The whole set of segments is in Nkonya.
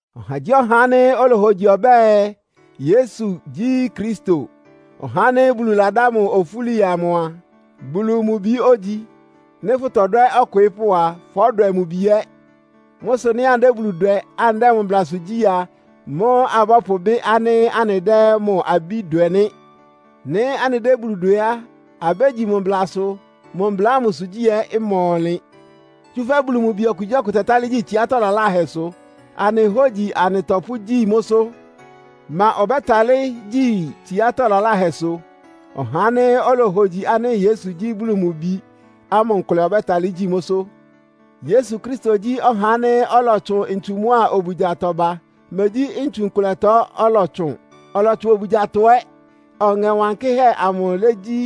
Ɔhagyíɔha ánɩ́ olohogyi ɔbɛ́ɛ, Yesu gyí Kristo, (ɔhá ánɩ́ Bulu ladá mʋ ofúli amʋ) a, Bulu mʋ Bi ógyi. Nɩ́ fʋtɔdwɛ́ ɔkwɩɩ́pʋ́ a, fɔ́dwɛ mʋ bi ɛ́. Mʋ́ sʋ nɩ́ anɩdɛ́ Bulu dwɛ, anɩdɛ́ mʋ mblasʋ gyí a, mʋ́ abɔ́pʋbɩ́ ánɩ́ anɩdɛ́ mʋ abí dwɛ nɩ́. Nɩ́ anɩdɛ́ Bulu dwɛ á, abégyi mʋ mblasʋ. Mʋ mbla ámʋsʋ gyí ɛ́ ɩma ɔnlɩn. Tsúfɛ́ Bulu mʋ bi okugyíɔkʋ tɛtálɩ́ gyi tsiátɔ́ laláhɛsʋ. Anɩ hógyi anɩtɔpʋ́gyí mʋ́sʋ́. Ma ɔbɛ́talɩ́ gyi tsiátɔ́ laláhɛsʋ? Ɔhá ánɩ́ olohogyi ánɩ́ Yesu gyí Bulu mʋ Bi ámʋ nkʋlɛ ɔbɛ́talɩ́ gyi mʋ́sʋ́. Yesu Kristo gyí ɔhá ánɩ́ ɔlɔtsʋn ntsu mʋ́a obugyatɔ ba. Megyí ntsu nkʋlɛtɔ ɔlɔtsʋn. Ɔlɔtsʋn obugyatɔ ɛ́. Ɔŋɛ Wankɩ́hɛ́ amʋ légyí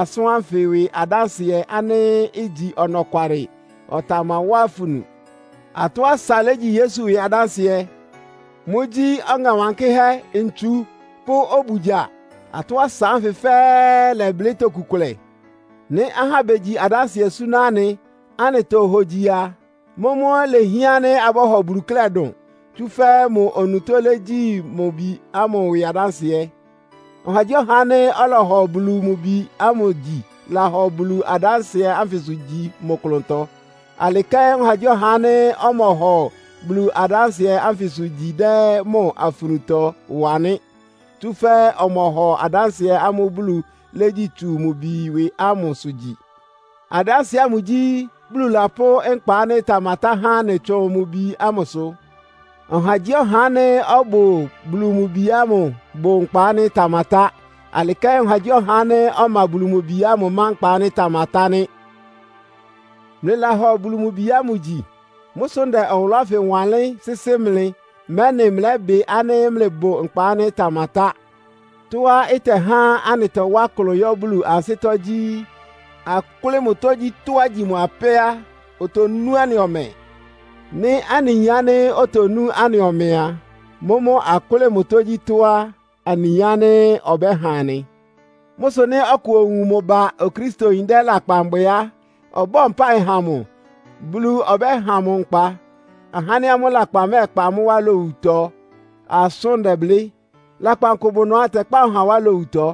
asʋ́n ánfɩ ɩwɩ adánsɩɛ, ánɩ́ igyi ɔnɔkwalɩ. Ɔtamawá afunu. Atɔ́ asa légyi Yesu ɩwɩ adánsɩɛ. Mʋ́gyí, Ɔŋɛ Wankɩ́hɛ́, ntsu pʋ́ obugya. Atɔ́ asa ánfɩ fɛ́ɛ́ lɛblɩ́ toku kʋlɛ. Nɩ́ ahá begyi adánsɩɛ súná anɩ, anɩtohogyi a, mʋ́mʋ́ ilehián ánɩ́ abɔ́hɔ Bulu klɛ́ dʋn. Tsúfɛ́ mʋ onutó légyi mʋ Bi ámʋ ɩwɩ adánsɩɛ. Ɔhagyíɔha ánɩ́ ɔlɔhɔ Bulu mʋ Bi ámʋ gyi lahɔ Bulu adánsɩɛ ánfɩsʋ gyi mʋ klʋntɔ. Alɩ kɛ́n ɔhagyíɔha ánɩ́ ɔmɔhɔ Bulu adánsɩɛ ánfɩsʋ gyi dɛ́ mʋ afunutɔ wa nɩ́. Tsúfɛ́ ɔmɔhɔ adánsɩɛ ámʋ́ʋ́ Bulu légyi tsu mʋ Bi ɩwɩ ámʋsʋ gyi. Adánsɩɛ ámʋ gyí, Bulu lapʋ́ nkpa ánɩ́ ɩtamatá há anɩ tsʋn mʋ Bi ámʋsʋ. Ɔhagyíɔha ánɩ́ ɔbʋ Bulu mʋ Bi ámʋ bʋ nkpa ánɩ́ ɩtamatá. Alɩ kɛ́n ɔhagyíɔha ánɩ́ ɔma Bulu mʋ Bi ámʋ má nkpa ánɩ́ ɩtamatá nɩ́. Mlɩlahɔ Bulu mʋ Bi ámʋ gyi. Mʋ́ sʋ ndɛ ɔwʋlʋ́ ánfɩ wanlɩ́n sɩ́sɩ́ mlɩ, mɛ́nɩ mlɛ́bɩ ánɩ́ mlɩbʋ nkpa ánɩ́ ɩtamatá. Tɔ́á ɩtɛhá anɩtɔwá klʋn yɔ́ Bulu ansɩ́tɔ́ gyí, akʋ́lɩ́ mʋ tógyítɔ́á igyi mʋ apɛ́ á, otonú anɩ ɔmɛ. Nɩ́ anɩyin ánɩ́ otonú anɩ ɔmɛ a, mʋ́mʋ́ akʋ́lɩ́ mʋ tógyítɔ́ á, anɩyin ánɩ́ ɔbɛ́ha anɩ. Mʋ́ sʋ nɩ́ ɔkʋ owun mʋ ba Okristoyin dɛ́ lakpan bwɛ á, ɔbɔ́ɔ mpáɩ ha mʋ. Bulu ɔbɛ́ha mʋ nkpa. Ahá ánɩ́ amʋ́ lakpan mɛ́ɛkpa amʋ́ wá lowutɔ asʋ́n ndɛblɩ́. Lakpan kʋ bʋ ɩnʋá ɩtɛkpá ɔhá wá lowutɔ.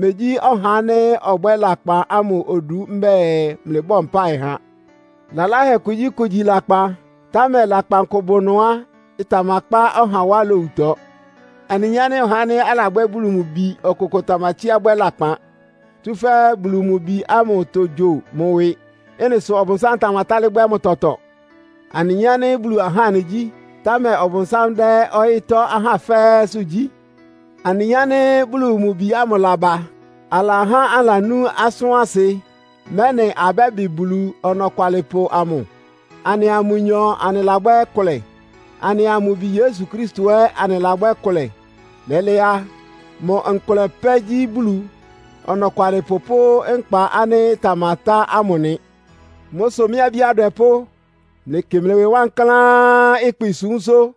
Megyí ɔhá ánɩ́ ɔbwɛ́ lakpan ámʋ odu mbɛ́ɛ mlɩbɔ́ɔ mpáɩ ha. Lalahɛ kugyíkʋ igyi lakpan, támɛ lakpan kʋ bʋ ɩnʋá ɩtamakpá ɔha wá lowutɔ. Anɩyin ánɩ́ ɔhá ánɩ́ alabwɛ́ Bulu mʋ bi ɔkʋkʋ tamatsíá bwɛ́ lakpan, tsúfɛ́ Bulu mʋ Bi ámʋ togyo mʋ ɩwɩ. Ɩ́nɩ sʋ Ɔbʋnsám tamatálɩ́ bwɛ́ mʋ tɔtɔ. Anɩyin ánɩ́ Bulu ahá anɩgyí, támɛ Ɔbʋnsám dɛ́ ɔyɩ́tɔ́ ahá fɛ́ɛ́sʋ́ gyí. Anɩyin ánɩ́ Bulu mʋ Bi ámʋ laba. Alahá anɩlanú asʋ́n asɩ, mɛ́nɩ abɛ́bɩ Bulu Ɔnɔkwalɩpʋ amʋ. Anɩa mʋnyɔ anɩlabwɛ́ kʋlɛ, anɩa mʋ Bi Yesu Kristo ɛ́ anɩlabwɛ́ kʋlɛ. Lɛ́lɛ́ á, mʋ nkʋlɛ pɛ́ gyí Bulu Ɔnɔkwalɩpʋ pʋ́ nkpa ánɩ́ ɩtamatá ámʋ nɩ. Mʋ́ sʋ mɩ́ abí adwɛpʋ́, mlɩkɩ mlɩ ɩwɩ wankláán ɩkpɩsúmsʋ́.